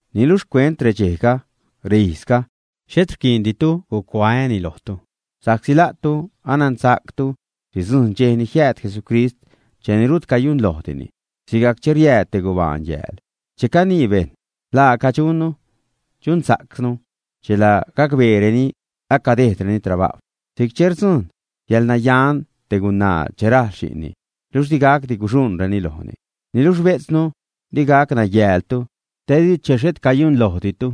Niluxh xcuent redxejga, reijzga, xhet riquiinditu gucuaäni lojtu, sa'csi la'tu anansa'ctu sidzujṉ dxej ni jiääd Jesucrist cheni rut cayunlojdini, sigajc che riääd te gubaan yääl. Che canii bejṉ: “laaca dxunnu, dxunsa'cnu”, chela gacbeereni acadejdreni trabajw si'c che rdzujṉ yäḻnayan te gunaa che rajl xi'nni, luxh digacdi guxuṉreni lojni. Niluxh bejtznu, di gac nayäältu te di che xhet cayunlojditu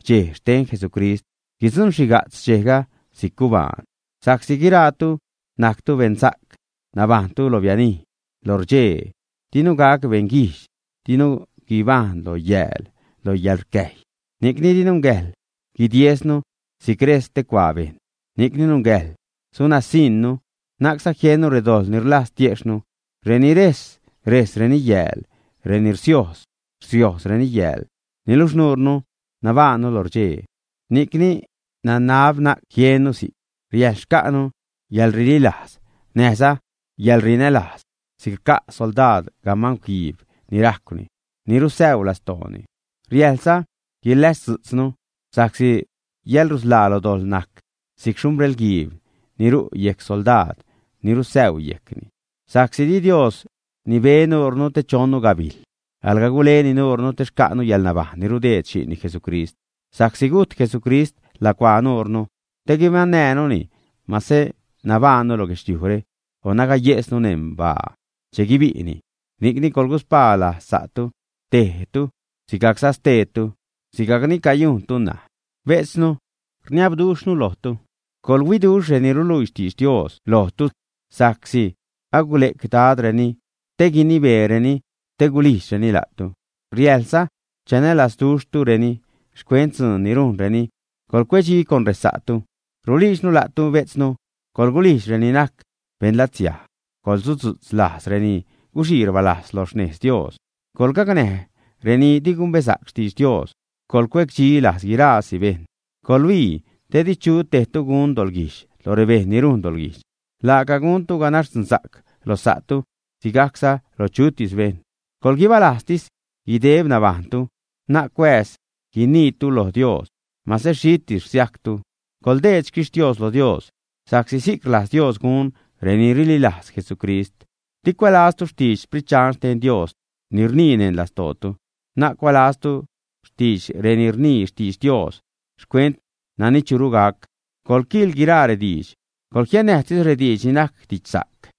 dxej xten Jesucrist, guidzuṉxhiga'tz dxejga si'c gubaan. Sa'csi guiraatu najctu beṉsa'c nabajṉtu lo bianij, lo rdxee, dinu gac beṉguijdx, dinu guibajṉ lo yääl, lo yäḻrcäjy. Ni'cni di nungäjḻ guidiesnu si'c rejs stecuaa bejṉ, ni'cni nungäjḻ sunasiṉnu na'cza jiennu redojḻ ni rlajz tiejxhnu. Reni rejs, rejsreni yääl, reni rsiojz, rsiojzreni yääl. Niluxh nuure nabajṉnu lo rdxee, ni'cni nanab na'c jiennu si'c, riäjḻ xca'nu yäḻrililajz näjza yäḻrinälajz si'c rca' soldaad gamangw guiib ni rajcwni, ni rusäuu lastooni. Riäjḻza guiläzdzu'tznu sa'csi yäḻrusḻaa lo dojḻ najc si'c xhumbrel-guiib ni ru' yejc soldaad ni rusäuu yejcni. Sa'csi di Dios nibe nuurnu te chonnu gabijl, alga guleni nuurnu te xca'nu yäḻnabajṉ ni rudeed xi'nni, Jesucrist. Sa'csi gujt Jesucrist lacuaa nuurnu, te guibaṉnäjnuni masä nabajṉnu lo guedxliujre o nagayejsnu neṉ baa che guibi'ni. Ni'cni, coḻguspaa lajz sa'tu, tejtu sigajcza steetu, sigajcni cayujntu ṉaj. Bejtznu, rniabduxhnu lojtu, coḻhuiduxh reni ruluii xtidx Dios lojtu, sa'csi agule'c Dadreni te guinibeereni, te gulijdxreni la'tu. Riäjḻza chanälazduxhtureni xcuent dzuun ni rujnreni. Coḻcuedxi con resa'tu. Rulijdxnu la'tu, bejtznu, coḻgulijdx reni najc beṉlatsiaj; coḻsudzu'tz lajz reni guxii rbalajz lo xnez Dios; coḻgacnäj reni di gumbesa'c xtidx Dios, coḻcuecdxi lajz guiraasi bejṉ. Coḻhuii di chu tejtu gunza doḻguijdx lo rebejṉ ni rujn doḻguijdx. Laaca guntu ganax dzunsa'c lo sa'tu, sigajcza lo chutis bejṉ. Coḻguibalajztis guideb nabajṉtu. Na'c cuääz guiniitu lo Dios. Mase xhitis rsiajctu, coḻdeed xquixtios lo Dios, sa'csi si'c rlajz Dios gun reni rililajz Jesucrist. Di cuälaztu xtidx Sprit Dxan xten Dios ni rniini neṉ lastootu. Na'c cuälaztu xtidx reni rnii xtidx Dios xcuent nani churu gac. Coḻquiil guiraa rediidx, coḻjiannäjtis rediidx ni najc didxsa'c.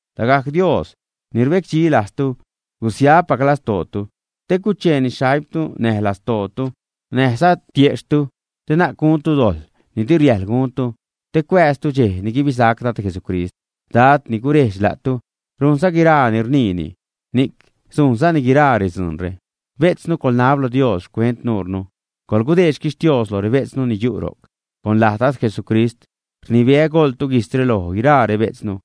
Lagajc Dios, Dios ni rbecdxi lajztu, gusiapac lastootu, te cucheeni xaimtu, näj lastootu, näjza tiejxhtu, te na'c guntu dojḻ ni di riäjḻ guntu te cuääztu dxej ni guibisac Dad Jesucrist. Dad ni gurejdx la'tu rujnza guiraa ni rniini, ni'c sujnzani guiraa redzuunre. Bejtznu, coḻnab lo Dios xcuent nuurnu. Coḻgudeed xtixtios lo rebejtznu ni yu' ro'c. Con laj Dad Jesucrist rnibeä, goḻtu guijtzre loj guiraa rebejtznu.